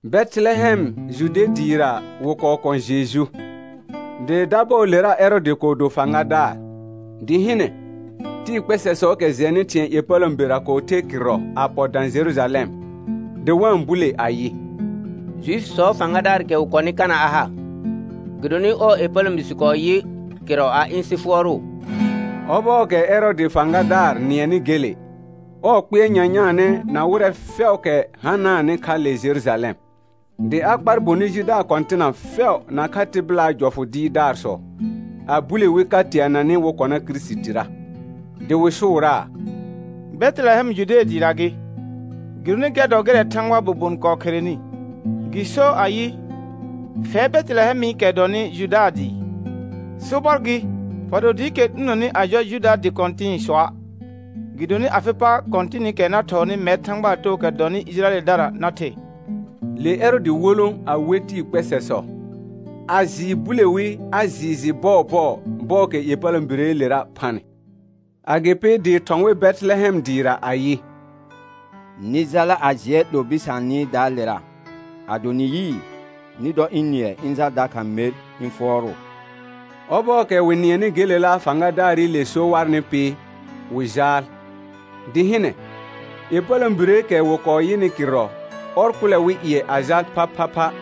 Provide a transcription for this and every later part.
Bɛtɩlɛhɛm Jude dɩɩra wɩ kɔɔ kɔ̃ Jeju, dɩ dabɔɔlera Ɛrɔɔdɩ kɔɔ do fãgadaar. Dɩ hɩnɛ, tɩɩ kpɛsɛsɔɔkɛ jɛnɩ thɩ̃ɛ ƴepələ̃berə kɔɔ ther kɩrrɔ a pɔ dã Jerujalɛm, dɩ wa-n bule ayɩ: Juifisɔɔ fãgadaarɩkɛ wɩ kɔnɩ, kana a ha? Gɩdonɩ ɔɔ ƴepələ̃bi sɩ kɔɔ yɩ kɩrrɔ a ɩ̃ sɩ fʋɔrʋʋ. Ɔbɔɔkɛ Ɛrɔɔdɩ fãgadaar nɩɛnɩ gele, ɔɔ kpɩɛr nyanyaanɛ na wɩrɛ fɛʋʋkɛ hanaanɩ kha le Jerujalɛm. Dɩ a kpar bonɩ jidaar kɔ̃tɩna fɛʋ nakha tɩbɩlaa jɔfʋ dɩɩrdaarsɔ, a bule wi ka teananɩ wɩ kɔna Kirisitira. Dɩ wɩ sʋʋraa: Bɛtɩlɛhɛm Jude dɩɩra gɩ, gɩdonɩ gɛr dɔ gɩrɛ Thãgbaa bobon kɔɔ kherenɩ, gɩ sor ayɩ: «Fɛr Bɛtɩlɛhɛmɩkɛ dɔnɩ Juda dɩɩ, sobɔr gɩ, fa do dɩɩkɛ 'lunoni a jɔ Juda dɩ kɔ̃tɩ̃sɔa'. Gɩdonɩ afɩ pa kɔ̃tɩnɩkɛ na thɔɔnɩ mɛr Thãgbaa tookɛ dɔnɩ Ɩjɩrayɛldara na the.» Le Ɛrɔɔdɩ wolõ a we tɩɩ kpɛsɛsɔ, a jɩɩ bule wi a jɩɩ jɩ bɔɔbɔɔ bɔɔkɛ ƴepələ̃bireelera phanɩ. Agɩpɩ dɩ thɔ̃ wɩ Bɛtɩlɛhɛm dɩɩra ayɩ: Nɩ jala a jɩɛ 'lo bɩsaanɩdaalera; ado nɩ yɩɩ, nɩ dɔ ɩ̃ nɩɛ ɩ̃ jal dakha mer ɩ̃ fʋɔrʋʋ. Ɔbɔɔkɛ wɩ nɩɛnɩ gelela fãgadaarɩle so warnɩ pɩ, wɩ jaal. Dɩ hɩnɛ, ƴepələ̃bireekɛ wɩ kɔɔ yɩnɩ kɩrrɔ, ɔr kʋlɛ wɩ ƴɩɛ a jal phaphapha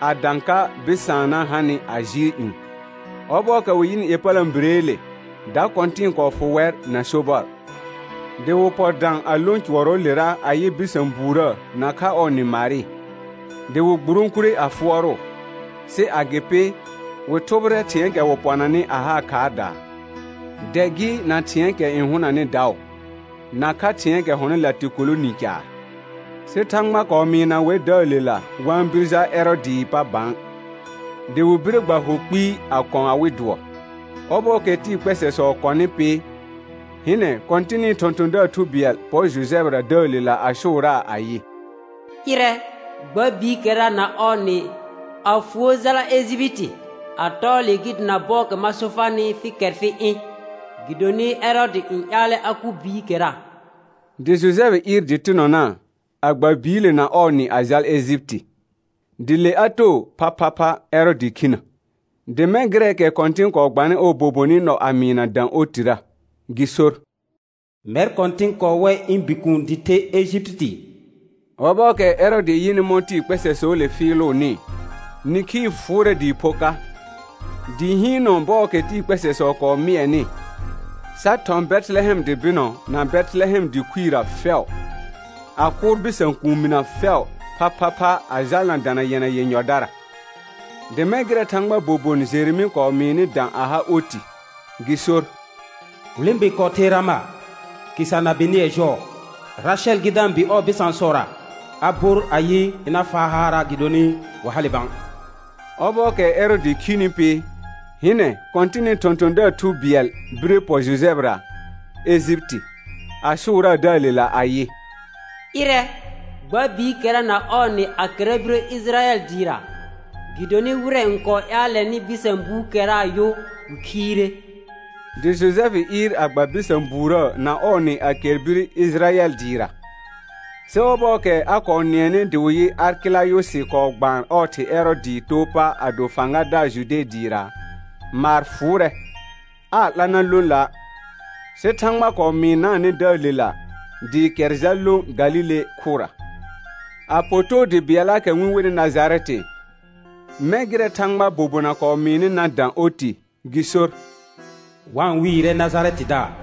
a dã ka bɩsaanna hanɩ a jɩɩl ƴũ. Ɔbɔɔkɛ wɩ yɩnɩ ƴepələ̃bireele, da kɔ̃tɩ̃ɩ kɔɔ fʋ wɛr na sobɔr. Dɩ wɩ pɔ dã a lõ cʋɔrɔɔlera a yɩ bɩsã buurə nakha ɔɔ nɩ Marɩ, dɩ wɩ gburõkure a fʋɔrʋʋ, sɩ agɩpɩ, wɩ thʋbɩrɛ thɩ̃ɛɛkɛ wɩ pɔnanɩ a haa khaardaa, dɛ gɩ na thɩ̃ɛɛkɛ n hʋnanɩ daʋ, nakha thɩ̃ɛɛkɛ hɔnɩ latɩkolo ni caar. Sɩ Thãgba kɔɔ mɩɩna wɛr dəəlela wa-n bir jal Ɛrɔɔdɩɩ pa bã, dɩ wɩ bire gba hʋ kpɩɩ a kɔ̃ awɩ dʋɔ. Ɔbɔɔkɛ tɩɩ kpɛsɛsɔ kɔnɩ pɩ, hɩnɛ Kɔ̃tɩnɩ thɔ̃thɔ̃daar thu bɩɛl pɔr Jojɛfɩra dəəlela a sʋʋraa ayɩ: Ɩrɛ, gba biikɛra na ɔɔ nɩ, a fuo jala Ejipiti, a tɔɔ le gɩ dana bɔɔkɛ ma so farnɩ fɩ kɛr fɩ ɩ̃, gɩdonɩ Ɛrɔɔdɩ n ƴaalɛ a kʋ biikɛra. Dɩ Jojɛfɩ ɩɩr dɩtɩnɔna, a gba biile na ɔɔ nɩ a jal Ejipiti. Dɩ le a too phaphapha Ɛrɔɔdɩ khinə, dɩ mɛ̃ gɩrɛɛkɛ Kɔ̃tɩn kɔɔ gbanɩ ɔɔ bobonɩ nɔ a mɩɩna dã otirə, gɩ sor: «Mɛr Kɔ̃tɩn kɔɔ wɛ ɩ̃ Bikuun dɩ the Ejipiti.» Ɔbɔɔkɛ Ɛrɔɔdɩ yɩnɩ mɔ̃ kpɛsɛsɔɔle fɩɩlʋʋnɩ, nĩkhii fʋʋrɛ dɩɩ pho ka, dɩ hɩɩnɔ bɔɔkɛ tɩɩ kpɛsɛsɔ kɔɔ mɩɛnɩ, sa thɔ̃ Bɛtɩlɛhɛm dɩ bɩnɔ na Bɛtɩlɛhɛm dɩ khuirə fɛʋ, a kʋʋr bɩsã kuuminə fɛʋ phaphapha a jalna dana yɛna yenyɔdara. Dɩ mɛ̃ gɩrɛ Thãgbaa bobon Jeremɩ kɔɔ mɩɩnɩ dã a ha oti, gɩ sor: «Hulẽbe kɔɔ ther Rama, khɩsa na benɩɛ jɔɔ. Rasɛl gɩ da-n bɩ ɔɔ bɩsãsɔra. A bor ayɩ, ɩna faa haara', gɩdonɩ wa hale bã.» Ɔbɔɔkɛ Ɛrɔɔdɩ khini pɩ, hɩnɛ Kɔ̃tɩnɩ thɔ̃thɔ̃daar thu bɩɛl bire pɔ Jojɛfɩra Ejipiti, a sʋʋraa dəəlela ayɩ: Ɩrɛ, gba biikɛra na ɔɔ nɩ a kɛra birə Ɩjɩrayɛl dɩɩra, gɩdonɩ wɩrɛ n kɔɔ ƴaalɛnɩ bɩsã buukɛraa yʋ wɩ khiire. Dɩ Jojɛfɩ ɩɩr a gba bɩsã buurə na ɔɔ nɩ a kɛr bir Ɩjɩrayɛl dɩɩra. Sɩ ɔbɔɔkɛ a kɔɔ nɩɛnɩ dɩ wɩ yɩ Arkɛlayʋsɩ kɔɔ gbaan ɔɔ thɩ Ɛrɔɔdɩɩ too pa a do fãgadaar Jude dɩɩra, maar fʋʋrɛ, aa 'la na lõ la', sɩ Thãgba kɔɔ mɩɩnaanɛ dəəlela, dɩ kɛr jal lõ Galile khʋra, a pɔ too dɩ bɩɛllaakɛ wɩ-n wenɩ Najarɛtɩ mɛ̃ gɩrɛ Thãgbaa bobona kɔɔ mɩɩnɩ na dã oti, gɩ sor: «Wa-n wɩɩrɛ Najarɛtɩdaar.»